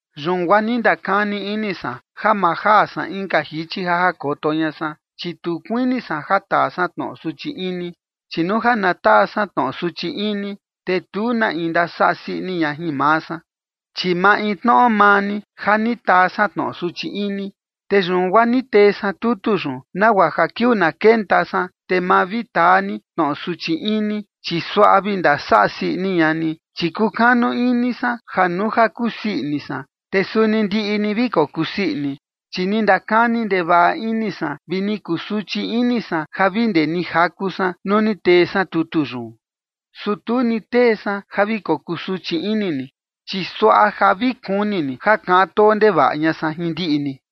Yun guaa ni ndakani ini san ja ma jaa san inka jichi ja jakoto ña san, chi tu kuini san ja taa san tnoꞌo suchi ini. Chi nuu ja na taa san tnoꞌo suchi ini, te tu na in ndasaꞌa sii ini ña jin maa san, chi maintnoꞌo maa ni ja ni taa san tnoꞌo suchi ini. Te yun guaa ni tee san tutu yun, nagua ja kiuu na kenta san, te ma vi taa ni tnoꞌo suchi ini, chi suaꞌa vi ndasaꞌa sii ini ña ni. Chi kukanu ini san ja nuu ja kusii ini san, te suni ndiꞌi ni vi kokusii ini. Chi ni ndakani ndevaꞌa ini san vi ni kusuchi ini san ja vi ndee ni jaku san nuu ni tee san tutu yun. Su tu ni tee san ja vi kokusuchi ini ni, chi suaꞌa ja vi kuni ni ja kaꞌan too ndevaꞌa ña san jin ndiꞌi ni.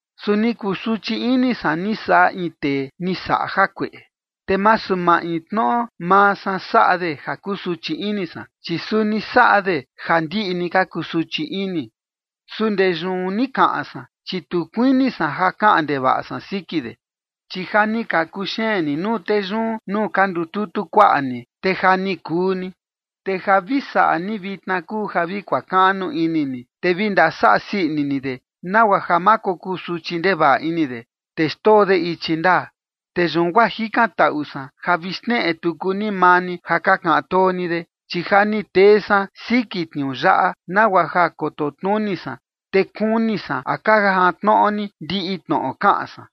Su ni kusuchi ini san ni saꞌa in tee ni saꞌa jakueꞌe, te masu maintnoꞌo maa san saꞌa de ja kusuchi ini san, chi suni saꞌa de ja ndiꞌi ni ka kusuchi ini. Su ndee yun ni kaꞌan san, chi tu kuini san ja kaꞌan ndevaꞌa san siki de. Chi ja ni ka kuxeen ni nuu tee yun nuu ka ndututu kuaꞌa ni, te ja ni kuu ni. Te ja vi saꞌa ni vitna kuu ja vi kuakaꞌnu ini ni, te vi ndasaꞌa sii ini ni de, nagua ja ma kokusuchi ndevaꞌa ini de, te xndoo de ichi ndaa. Te yun guaa jikantaꞌu san ja vi xneꞌe tuku ni maa ni ja ka kaꞌan too ni de. Chi ja ni tee san siki tniuu yaꞌa, nagua ja koto tnuni san, te kuni san a ka jantnoꞌo ni ndiꞌi tnoꞌo kaꞌan san.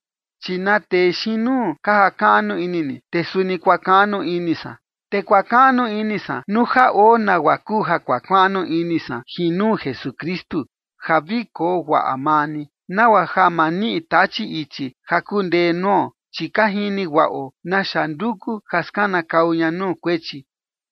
Chi na tee xiin nuu ka jakaꞌnu ini ni, te suni kuakaꞌnu ini san. Te kuakaꞌnu ini san nuu ja oo nagua kuu ja kuakaꞌnu ini san jin nuu Jesukristu, ja vi koo guaꞌa maa ni, nagua ja ma niꞌi Tachi ichi ja kundee nuo, chi ka jini guaꞌo naxa nduku ja skanakau ña nuu kuechi.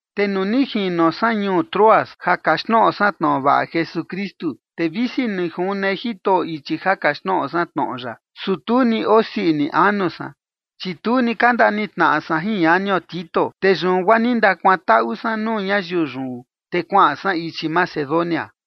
Te nuu ni jino san ñuu Troas ja kaxtnoꞌo san tnoꞌo vaꞌa Jesukristu, te visi ni june Jitoꞌo ichi ja kaxtnoꞌo san tnoꞌo ya, su tu ni osii ini anu san, chi tu ni ka ndanitnaꞌa san jin ñanio Tito. Te yun guaa ni ndakuantaꞌu san nuu ñayiu yun, te kuaꞌan san ichi Macedonia.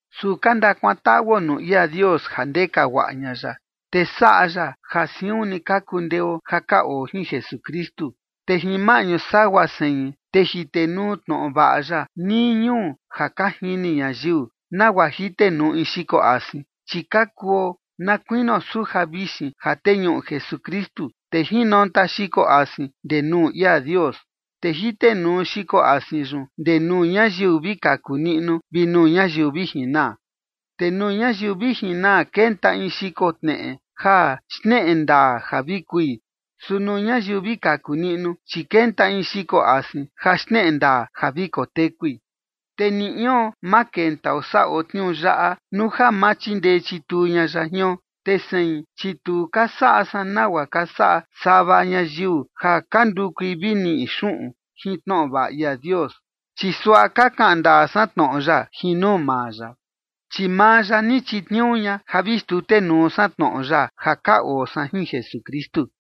Su ka ndakuantaꞌuo nuu ia Dios ja ndeka guaꞌa ña ya, te saꞌa ya ja siun ni ka kundeo ja ka oo jin Jesukristu, te jin maꞌñu sagua sein, te jitenuu tnoꞌo vaꞌa ya nii ñuu ja ka jini ñayiu, nagua jitenuu in xiko asin. Chi ka kuo na kuinio suja vixin ja teñuꞌu Jesukristu, te jinonta xiko asin ndee nuu ia Dios. Te jitenuu xiko asin yun ndee nuu ñayiu vi kaku niꞌnu vi nuu ñayiu vi jinaa. Te nuu ñayiu vi jinaa kenta in xiko tneꞌe ja xneꞌe ndaa ja vi kui, su nuu ñayiu vi kaku niꞌnu, chi kenta in xiko asin ja xneꞌe ndaa ja vi kotekui. Te ni ion ma kentao saꞌo tniuu yaꞌa nuu ja ma chindee chituu ña ya jion. Te sein, chi tu ka saꞌa san nagua ka saꞌa sava ñayiu ja ka ndukui vi ni niꞌi xuꞌun jin tnoꞌo vaꞌa ia Dios. Chi suaꞌa ka kaꞌan ndaa san tnoꞌo ya jin nuu maa ya, chi maa ya ni chitniuu ña ja vi xtutenuu san tnoꞌo ya, ja ka oo san jin Jesukristu.